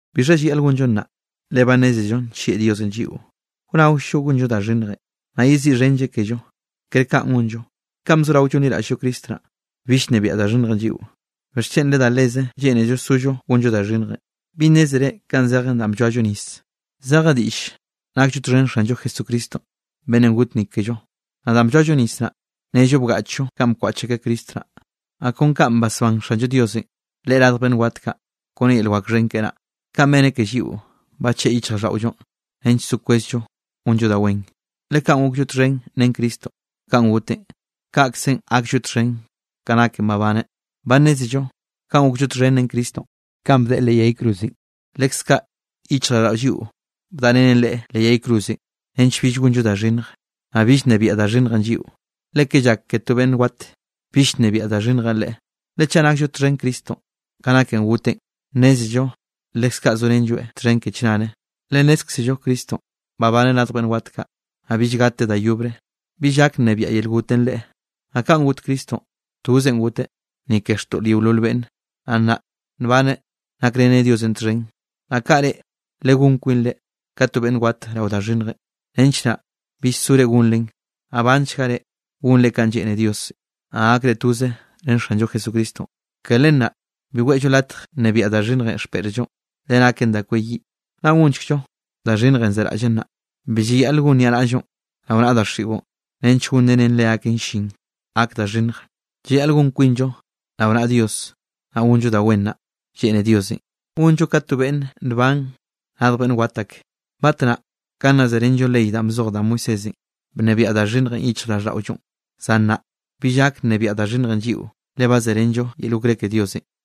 ¿Bixha llayaꞌl gonllo nnaꞌ, le ba nnézello nllieꞌ Diosenꞌ lliꞌo? ¿Wnaoll-llo gonllo da xhinnjenꞌ, naꞌ yeziꞌxhenlleꞌ kello? Kere kaꞌn gonllo. Kanꞌ bzorao llonliraꞌll-llo Cristo naꞌ, bill bnebiaꞌ da xhinnjenꞌ lliꞌo. ¿Bixchen le da leze lleꞌnello sollo gonllo da xhinnjenꞌ? ¿Bi nnézere kanꞌ zejen danꞌ blloallo nis? Zeje diꞌll nakllo txhen Xanllo Jesucristo beꞌnnenꞌ got ni kello. Naꞌ danꞌ blloallo nis naꞌ, nnello bgaꞌchllo kanꞌ bkwaꞌch akeꞌ Cristo naꞌ. Naꞌ kon kanꞌ basbán Xallo Diosenꞌ Leꞌe radj beꞌnn wat kaꞌ kone yel wak xhen keꞌe naꞌ, kaꞌn beneꞌ ke lliꞌo, bacheꞌe yichjraꞌlldaꞌollonꞌ nench so kwezllo gonllo da wen. Le kanꞌ gokllo txhen ren Cristonꞌ kanꞌ goteꞌn, kaꞌkzenꞌ gaklloeꞌ txhen ka naken babaneꞌn. Ba nnézello kanꞌ gokllo txhen ren Cristonꞌ kanꞌ bdeꞌe leꞌ yay cruzenꞌ, leskaꞌ yichjraꞌlldaꞌo lliꞌo bdaꞌrenen Leꞌe leꞌ yay cruzenꞌ nench bill gonllo da xhinnj, naꞌ bill nnebiaꞌ da xhinnjenꞌ lliꞌo. Le ke llak ke to beꞌnn wat, bill nnebiaꞌll da xhinnjenꞌ leꞌe. Le chaꞌ nakllo txhen ren Cristonꞌ ka naken goteꞌn, nnézello leskaꞌ sorenlloeꞌ txhen ke chnare. Le nnézkzello Cristonꞌ babaneꞌ radj beꞌnn wat kaꞌ, naꞌ bill gateꞌ da yobre, bill gak nnebiaꞌ yel gotenꞌ Leꞌe. Naꞌ kanꞌ got Cristonꞌ, tozenꞌ goteꞌ, ni ke xtoꞌl yeolol beꞌnne. Naꞌ nnaꞌ nbaneꞌ nakreneꞌ Diosenꞌ txhen. Naꞌ kaꞌ reꞌ, legón kwinre ka to beꞌnn wat rao da xhinnjenꞌ, nench naꞌ bill sore gonren, naꞌ banchga reꞌ gonre kanꞌ lleꞌne Diosenꞌ, naꞌ gakre toze ren Xanllo Jesucristonꞌ. Ke len naꞌ bi weꞌllo latj nnebiaꞌ da xhinnjenꞌ xpeꞌrllonꞌ, le naken da kweyiꞌ, naꞌ gonchekllo da xhinnjenꞌ zeraꞌllen naꞌ. Bi llayaꞌl gon niaꞌnaꞌllonꞌ rao naꞌa daxiꞌon nench gonrenen leaken llin gak da xhinnj. Llayaꞌl gonllo kwinllo rao naꞌa Diosenꞌ, naꞌ gonllo da wen naꞌ lleꞌne Diosenꞌ, gonllo ka to beꞌnn nban radj beꞌnn wat ake. Batnaꞌ ka nna zerenllo ley danꞌ bzoj da Moisésenꞌ, bnebiaꞌ da xhinnjenꞌ yichjraꞌlldaꞌollonꞌ. Zan nnaꞌ bill gak nnebiaꞌ da xhinnjenꞌ lliꞌo le ba zerenllo yel okré ke Diosenꞌ.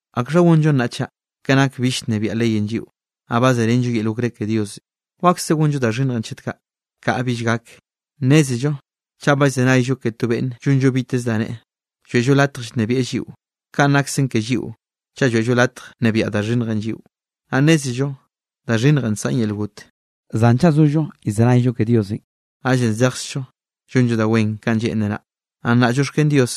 ¿Akxhanꞌ gonllo nnaꞌ chaꞌ? Ke nak bill llnebiaꞌ leyenꞌ lliꞌo, naꞌ ba zerenllo yel okré ke Dios, ¿wakse gonll-llo da xhinnjenꞌ chet kaꞌ? ¡Kaꞌa bill gak! Nnézello chaꞌ ba llzenayllo ke to beꞌnne llonllo biteze da neꞌe, lloeꞌllo latj llnebieꞌ lliꞌo. Kanꞌ naksen ke lliꞌo chaꞌ lloeꞌllo latj nnebiaꞌ da xhinnjenꞌ lliꞌon, naꞌ nnézello da xhinnjenꞌ nsaꞌn yel got; zan chaꞌ zollo llzenayllo ke Diosenꞌ, naꞌllenꞌ zejkzllo llonllo da wen kanꞌ lleꞌnreꞌ naꞌ. Naꞌ nnaꞌ llioxken Dios,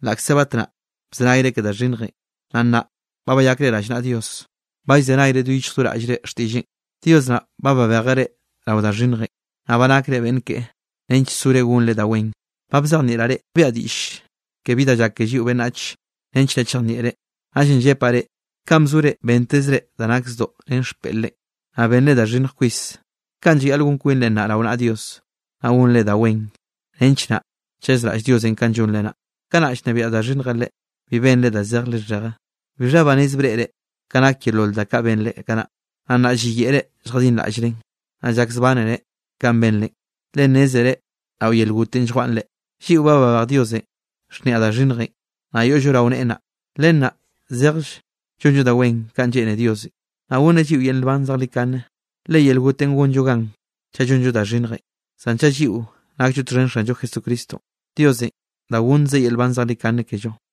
laꞌkze batnaꞌ bzenayre ke da xhinnjenꞌ, naꞌ nnaꞌ ba bayakre rallnaꞌa Dios, ba llzenayre do yichj do raꞌllre xtiꞌlleꞌn. Dios naꞌ ba babejeꞌ reꞌ rao da xhinnjenꞌ, naꞌ ba nakre beꞌnn keꞌe nench sore gonre da wen. Ba bzejnieꞌraꞌ reꞌ, biaꞌa diꞌll ke bi da llak ke lliꞌo beꞌnnach nench naꞌ chejnieꞌre. Naꞌllenꞌ llepaꞌ reꞌ, kanꞌ bzore bentezre da nak zdoꞌ ren xpeꞌr-re, naꞌ benre da xhinnj kwis, kaꞌn llayaꞌl gon kwinre nnaꞌ rao naꞌa Dios, naꞌ gonre da wen nench naꞌ chazraꞌll Diosenꞌ kanꞌ llonre naꞌ. Kanꞌ nna llnebiaꞌ da xhinnjenꞌ reꞌ, bi benre da zej lixheje. ¿Bixha banez breꞌre ka nak yeolol da kaꞌ benre kanaꞌ? Naꞌ nnaꞌ lliyeꞌre lljadinraꞌllrenꞌ, naꞌ llakzbánere kanꞌ benre, le nnézere rao yel gotenꞌ lljwaꞌn reꞌ. Lliꞌo ba babej Diosenꞌ xhniaꞌ da xhinnjenꞌ, naꞌ yoꞌllo rao neꞌe naꞌ. Len naꞌ zejll llonllo da wen kanꞌ lleꞌne Diosenꞌ, naꞌ gonneꞌ lliꞌo yel nban zejlikane. Le yel gotenꞌ gonllo gan chaꞌ llonllo da xhinnjenꞌ, zan chaꞌ lliꞌo nakllo txhen Xanllo Jesucristonꞌ, Diosenꞌ da gonnzeꞌ yel nban zejlikane kello.